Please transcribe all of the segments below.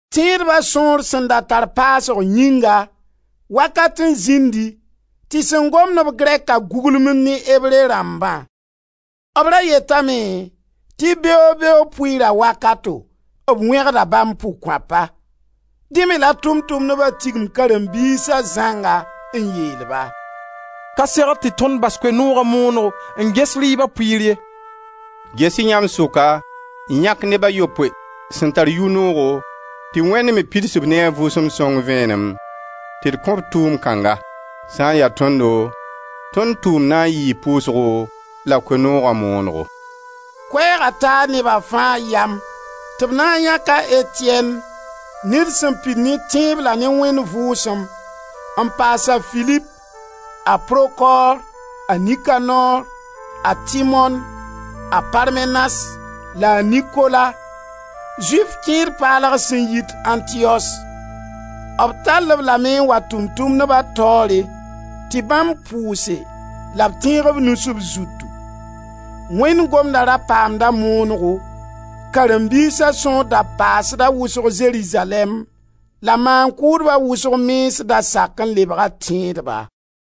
Tẽedba sõor sẽn da tar paasg yĩnga, wakat n zĩndi tɩ sẽn gomd-b grɛka guglem ne Ebre rãmbã. B ra yetame tɩ beoog-beoog pʋɩɩra wakato, b wẽgda bãmb pʋg-kõapa. Dẽ me la Tʋʋm-tʋmdba tigim karen-biisa zãnga n yeel-ba: «Ka segd tɩ tõnd bas Koe-nooga moonego n ges rɩɩba pʋɩɩr ye. Ges-y yãmb sʋka n yãk neb a yopoe sẽn tar yʋ-noogo, tɩ Wẽnd me pids-b ne a Vʋʋsem Sõng vẽenem, tɩ d kõ-b tʋʋmd kãnga.» Sã n ya tõndo, tõnd tʋʋmd na n yii pʋʋsgo la Koe-nooga moonego. Koɛɛga taa neba fãa yam tɩ b na n yãk a Etiyɛn ned sẽn pid ne tẽeb la ne Wẽnd Vʋʋsem, n paas a Filip, a Prokor, a Nikanor, a Timon, a Parmenas la a Nikola, Zʋɩf kẽed paalg sẽn yit Antiyos B tall-b lame n wa Tʋʋm-tʋmdba taoore tɩ bãmb pʋʋse la b tẽeg b nus b zutu. Wẽnd Gomda ra paamda moonego. Karen-biisa sõor da paasda wʋsg Zerizalɛɛm la maan-kʋʋdba wʋsg mens da sak n lebga tẽedba.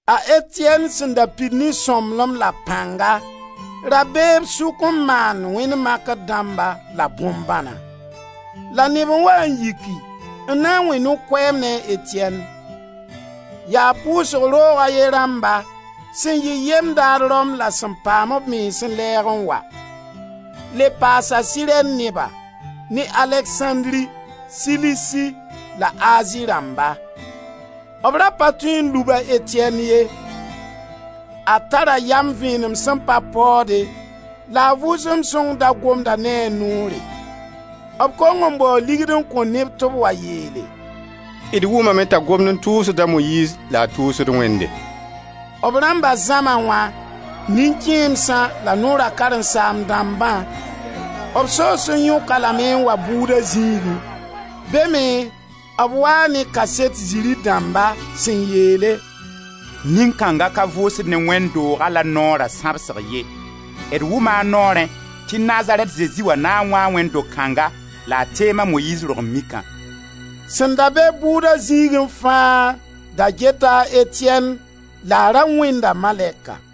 A Etiyɛn sẽn da pid ne sõmblem la pãnga, ra bee b sʋk n maand wẽnd makr dãmba la bõn-bãna. La neb n waa n yiki n na n wẽ no-koɛɛm ne a Etiyɛn. Yaa pʋʋsg roog a ye rãmba sẽn yɩ yem-daad Rom la sẽn paam b mens n lɛɛg n wa. Le paasa Sirɛn neba, ne Aleksãndri, Silisi la Azi rãmba. B ra pa tõe n lub a Etiyɛn ye. A tara yam vẽenem sẽn pa paoode la a Vʋʋsem Sõng da gomda ne a noore. B kong n bao ligd n kõ neb tɩ b wa yeele: «D wʋmame t'a gomd n tʋʋsd a Moyiiz la a tʋʋsd Wẽnde.» B rãmba Zãma wã, nin-kẽemsã la Noora karen-saam-dãmbã. B soos n yõk-a lame n wa bʋʋda zĩigẽ. Be me b waa ne kaset ziri dãmba sẽn yeele: «Nin-kãnga ka vʋʋsd ne wẽnd dooga la Noora sãbsg ye. D wʋma a noorẽ tɩ Nazarɛt Zezi wã na n wãa wẽnd do-kãnga la a teem a Moyiiz rog-n-mikã.» Sẽn da be-b bʋʋda zĩigẽ fãa da geta a Etiyɛn laa ra wẽnda malɛka.